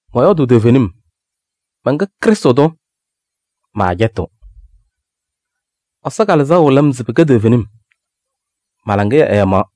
Mɔyɔɔdʋʋ toovenim, mɛnkɛ Krɩstʋ tʋ, maacɛtɩɣ. Ɛsɔ Kalɩzaɣ wɩlɩɣ-m se pɩkɛ toovenim, ma-laŋɩyɛ ɛɛmaɣ: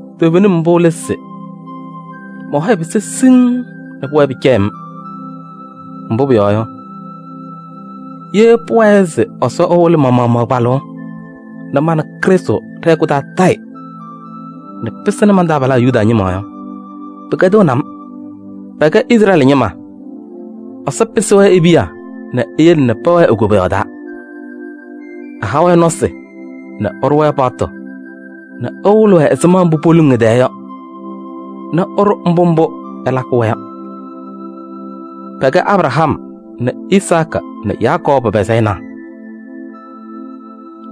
toovenim mbʋ lɛ se: mɔ-hɔyɛ pɩsaa siŋŋ nɛ pʋwɛɛ pɩcɛyɩɣ-m. Mbʋ pʋyɔɔ yɔ, ye pʋwɛɛ se Ɛsɔ ɛwɩlɩ ma-maɣmaɣ kpalʋʋ nɛ ma nɛ Krɩstʋ ɖɛ-hɛkʋ taa tayɩ nɛ pɩsɩnɩ man-taabalaa Yuda ñɩma yɔ, pɩkɛdɩɣnɩ-m. Pɛkɛ Izrɛɛlɩ ñɩma: Ɛsɔ pɩsɩ-wɛ e-piya nɛ eyele nɛ pɛwɛɛ e-koboyaɣ taa. Ɛha-wɛ nɔsɩ nɛ ɛɖʋ-wɛ paɣtʋ nɛ ɛwɩlɩ-wɛ ɛzɩma mbʋ poluŋ ɛ-tɛɛ yɔ nɛ ɛɖʋ mbʋ mbʋ ɛlakɩ-wɛ yɔ. Pɛkɛ Abraham nɛ Izaakɩ nɛ Yakɔɔbʋ pa-sayɩnaa.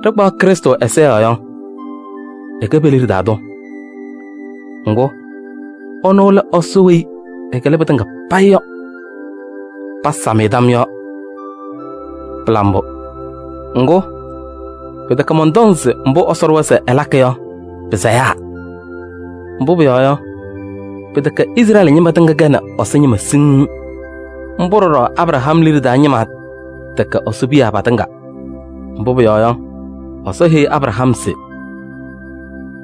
Ɖɩkpaɣ Krɩstʋ ɛza yɔɔ yɔ, ɛkɛ pe-liɖe taa tʋ. Ŋgʋ, ɛnʋ lɛ Ɛsɔ weyi ɛkɩlɩ pɩtɩŋa payɩ yɔ. Pasam-ɩ tam yɔɔ. Pɩla mbʋ! Ŋgʋ, pɩtɛkɛ mɔntɔŋ se mbʋ Ɛsɔ ɖʋwa se ɛlakɩ yɔ pɩsayaa. Mbʋ pʋyɔɔ yɔ, pɩtɛkɛ Izrɛɛlɩ ñɩma tɩŋa kɛnɩ Ɛsɔ ñɩma siŋŋ. Mbʋ ɖɔɖɔ Abraham liɖe taa ñɩma tɛkɛ Ɛsɔ piya patɩŋa. Mbʋ pʋyɔɔ yɔ, Ɛsɔ heyi Abraham se: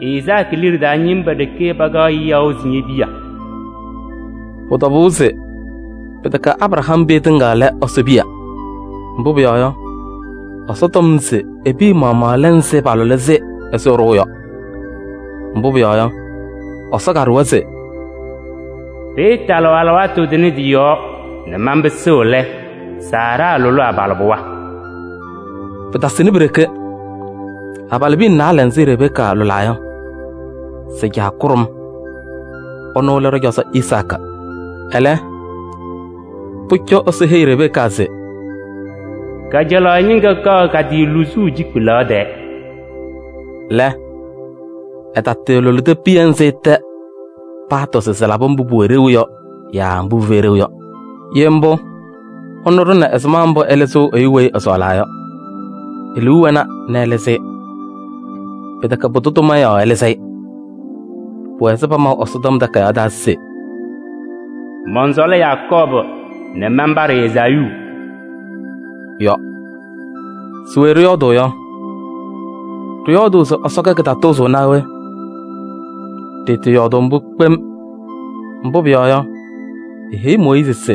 “Izaakɩ liɖe taa ñɩma ɖeke pakaɣ yaʋ se ñe-piya.” Pʋ-tɔbʋʋ se pɩtɛkɛ Abraham piya tɩŋa lɛ Ɛsɔ piya, mbʋ pʋyɔɔ yɔ, Ɛsɔ tɔm se e-piya maɣmaɣ lɛ nzɩ palʋlɩ-sɩ ɛzɩ ɛɖʋʋ yɔ. Mbʋ pʋyɔɔ yɔ, Ɛsɔ kaɖʋwa se: “Pɩɩtalɩɣ alɩwaatʋ tʋnɛ tɩ-yɔɔ nɛ manpɩsɩɣ lɛ, Saara lʋlɩ abalɩbɩɣa.” Pɩtasɩnɩ pi-ɖeke. Abalɩbiya naalɛ nzɩ Rebeka lʋlaa yɔ, sɩ-caa kʋɖʋm, ɛnʋ lɛ ɖɔ-cɔzɔ Izaakɩ. Ɛlɛ, pʋcɔ Ɛsɔ heyi Rebeka se: “Kajalaɣ ñɩŋga kaɣ ka-tɩ luzuu cikpelaɣ tɛɛ” lɛ, ɛtalʋlɩdɩ piya nzɩ tɛ paatɔ se sɩlabɩ mbʋ pʋwɛ ɖeu yɔ yaa mbʋ pɩfɛyɩ ɖeu yɔ. Ye mbʋ, ɛnʋ ɖʋna ɛzɩma mbʋ ɛlɩzɩɣ ɛyʋ weyi ɛsɔɔlaa yɔ. E-liu wɛna nɛ ɛlɩzɩ-ɩ. Pɩtɛkɛ pʋdʋ tʋma yɔɔ ɛlɩzɩ-ɩ. Pʋwɛ ɛzɩ pamaʋ Ɛsɔtɔm Takayaɣ taa se: “Mɔnsɔɔlɩ Yakɔɔbʋ nɛ manpaɖɩ Ezaayuu” yɔ. Se we ɖɩyɔɔdʋʋ yɔ? Ɖɩyɔɔdʋʋ se Ɛsɔ kɛ kɩtatʋʋzʋʋ naa we? Ɖɩɩtɩɩyɔɔdʋʋ mbʋ kpem! Mbʋ pʋyɔɔ yɔ, eheyi Mooyiizi se: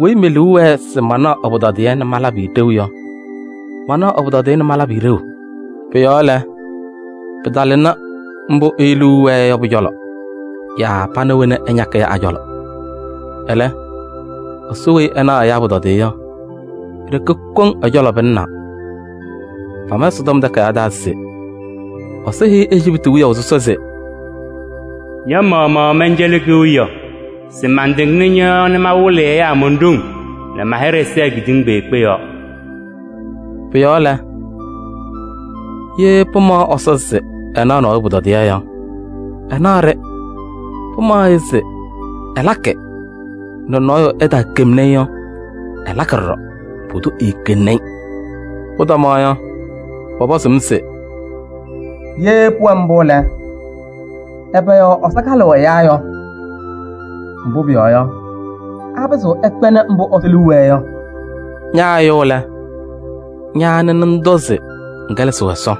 weyi me-liu wɛɛ se manaɣ ɛ-pʋtɔdɩyɛ nɛ malabɩ-ɩ ɖeu yɔ, manaɣ ɛ-pʋtɔdɩyɛ nɛ malabɩ-ɩ ɖeu. Pʋ-yɔɔ lɛ, pɩtalɩnɩ mbʋ ɛyʋ liu wɛɛ yɔ pʋ-cɔlɔ yaa pana wena ɛñakɩ yɔ a-cɔlɔ. Ɛlɛ, Ɛsɔ weyi ɛnaɣ ɛyaa pʋtɔdɩyɛ yɔ, e-ɖeke koŋ ɛ-cɔlɔ pɩlɩnaa. Pama Ɛsɔtɔm Takayaɣ taa se Ɛsɔ heyi Ejiptɩ wiyaʋ sɔsɔ se: “Ña-maɣmaɣ mɛncɛlɩ kewiyaɣ se mantɩŋnɩ ñɔ-yɔɔ nɛ mawɩlɩ ɛyaa mon-ɖoŋ nɛ ma-hɩɖɛ sɛɛ kedeŋa kpeekpe yɔɔ.” Pʋ-yɔɔ lɛ, ye pɩmaɣ Ɛsɔ se ɛnaɣ nɔɔyʋ pʋtɔdɩyɛ yɔ, ɛnaɣ-ɖɩ. Pɩmaɣ-ɩ se ɛlakɩ nɛ nɔɔyʋ ɛtaakemni-i yɔ, ɛlakɩ ɖɔɖɔ, pʋdʋ eekeŋni-i. Pʋtɔmaɣ yɔ, pɔpɔzʋʋ-m se: “Ye pʋwɛ mbʋ lɛ, ɛbɛ yɔɔ Ɛsɔ kalɩɣ ɛyaa yɔ? Mbʋ pʋyɔɔ yɔ, apɩzɩɣ ɛkpɛnɩ mbʋ Ɛsɔ liu wɛɛ yɔ?” Ña ɛyʋ lɛ, ña anɩ nɛ ŋtɔ se ŋkɛlɛsɩɣ Ɛsɔ?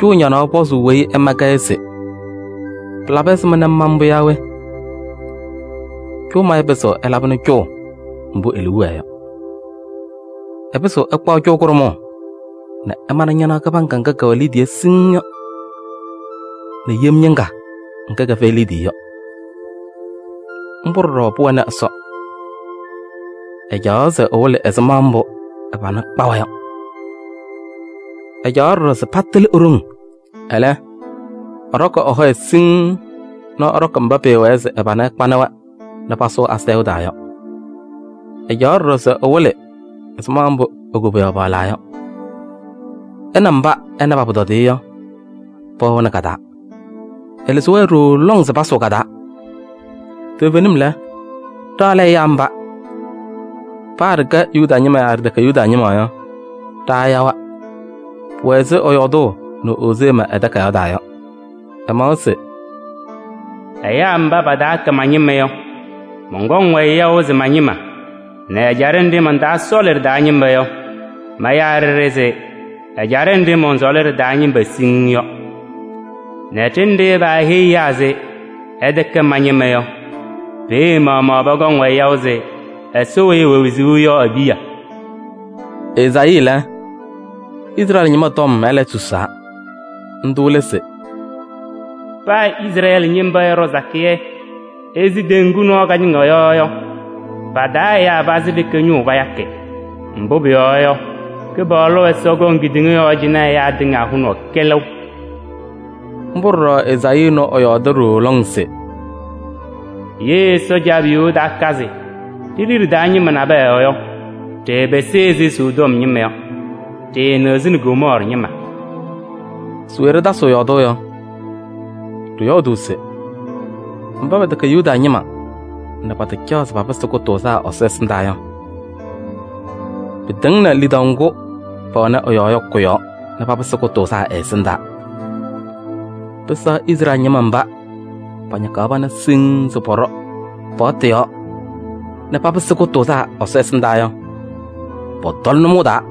Cʋʋ ñanaɣ pɔzʋʋ weyi ɛma-kɛ yɔ se: pɩlabɩ ɛzɩma nɛ ŋma-m mbʋ yaa we? Cʋʋ mayʋ pɩzɩɣ ɛlabɩnɩ cʋʋ mbʋ e-liu wɛɛ yɔ: ɛpɩzɩɣ ɛkpaɣ cʋʋ kʋɖʋmʋʋ nɛ ɛmanɩ ñanaɣ kɩbaŋga ŋga kɛwɛ liidiye siŋŋ yɔ nɛ yem ñɩŋga ŋga kɛfɛyɩ liidiye yɔ. Mbʋ ɖɔɖɔ pʋwɛnɩ Ɛsɔ, ɛcaɣaɣ se ɛwɩlɩ ɛzɩma mbʋ ɛ-pana kpawa yɔ. Ɛcaɣaɣ ɖɔɖɔ se patɩlɩ e-ɖoŋ. Ɛlɛ, ɛɖɔkɩ ɛ-hɔyɛ siŋŋ nɛ ɛɖɔkɩ mba pɩɩwɛɛ se ɛ-pana ɛkpanɩ-wɛ nɛ pasʋʋ asayʋʋ taa yɔ. Ɛcaɣaɣ ɖɔɖɔ se ɛwɩlɩ ɛzɩma mbʋ e-koboyaɣ paɣlaa yɔ. Ɛ nɛ mba ɛna pa-pʋtɔdɩyɛ yɔ, pɛwɛɣnɩ ka-taa. Ɛlɩzɩ-wɛ ɖooo lɔŋ se pasʋʋ ka-taa. Toovenim lɛ, ɖa lɛ ɛyaa mba. Paa ɖɩkɛ Yuda ñɩma yaa ɖɩtɛkɛ Yuda ñɩma yɔ, ɖa ɛyawa. Pʋwɛ ɛzɩ ɛyɔɔdʋʋ nɛ Ozee ma ɛ-takayaɣ taa yɔ. Ɛmawa se: “Ɛyaa mba pataakɛ ma-ñɩma yɔ, mɔnkɔŋ-wɛ yaʋ se ma-ñɩma nɛ ɛjaɖɛ nɖɩ mantaasɔɔlɩ ɖɩ-taa ñɩma yɔ, mayaa ɖɩɖɩ se ɛjaɖɛ nɖɩ mɔnsɔɔlɩ ɖɩ-taa ñɩma siŋŋ yɔ. Nɛ ɖenɖe paaheyi ɛyaa se: ‘Ɩtɛkɛ ma-ñɩma yɔ,’ peeye maɣmaɣ pɔkɔŋ-wɛ yaʋ se Ɛsɔ weyi ɛwɛ wezuu yɔ e-piya.” Ezaayii lɛ, Izrɛɛlɩ ñɩma tɔm ɛlɛ susaa. Ndʋ lɛ se: “Paa Izrɛɛlɩ ñɩma ɛɛɖɔ sakɩyɛ ɛzɩ teŋgu nɔɔ kañɩŋa yɔ yɔ, pa-taa ɛyaa pazɩ ɖeke ñʋʋ payakɩ. Mbʋ pʋyɔɔ yɔ, Kɩpaɣlʋ Ɛsɔ kɔŋ kedeŋa yɔɔ cɩnɛ ɛyaa tɩŋa hʋnaʋ kɛlɛʋ.” Mbʋ ɖɔɖɔ Ezaayii ɛnʋ ɛɛyɔɔdɩ ɖooo lɔŋ se: “Ye Ɛsɔ Caabiyuu ɛtaakazɩ ɖe-liɖe taa ñɩma nabɛyɛ yɔ, ɖɩɩpɩsɩ ɛzɩ sodom ñɩma yɔ. Ɖɩɩnɩɣzɩnɩ Gomɔɔrɩ ñɩma.” Se we ɖɩtasɩɣ yɔɔdʋʋ yɔ? Ɖɩyɔɔdʋʋ se: mba pɛtɛkɛ Yuda ñɩma nɛ pataacaɣ se papɩsɩ kʋtʋʋzaa Ɛsɔ ɛsɩndaa yɔ, pɩtɩŋnɩ lidaʋ ŋgʋ pɛwɛnɩ ɛ-yɔɔ yɔ kʋ-yɔɔ nɛ papɩsɩ kʋtʋʋzaa ɛ-ɛsɩndaa. Pɩsɛɣ Izrɛɛlɩ ñɩma mba pañakaɣ pana siŋŋ se pɔɖɔ paɣtʋ yɔɔ nɛ papɩsɩ kʋtʋʋzaa Ɛsɔ ɛsɩndaa yɔ, pɔtɔlɩ nʋmɔʋ taa.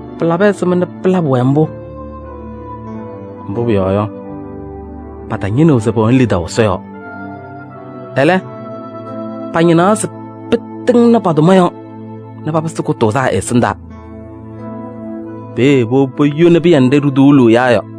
Pɩlabɩ ɛzɩma nɛ pɩlabɩ-wɛ mbʋ? Mbʋ pʋyɔɔ yɔ, patañɩnɩɣ se pɛwɛnɩ lidaʋ Ɛsɔ yɔɔ. Ɛlɛ, pañɩnaɣ se pɩtɩŋnɩ pa-tʋma yɔɔ nɛ papɩsɩ kʋtʋʋzaa ɛ-ɛsɩndaa. Peeye powobi poyoni pɩyɛ nɖɩ ɖituuluu ɛyaa yɔ.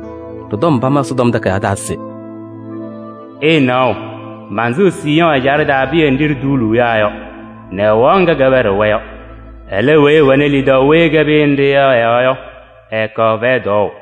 Ɖɩ-tɔm pama Ɛsɔtɔm Takayaɣ taa se: “Ɩɩnaɣ, mansɩɣ Siiyɔɔ ɛjaɖɛ taa pɩyɛ nɖɩ ɖituuluu ɛyaa yɔ nɛ ɛwaɣ ŋga kɛpɛɖɩɣ-wɛ yɔ. Ɛlɛ weyi ɛwɛɣnɩ lidaʋ weyi ɛkɛ pɩyɛ nɖɩ yɔ ɛ-yɔɔ yɔ, ɛɛkaɣ fɛyɛ tɔɔʋ.”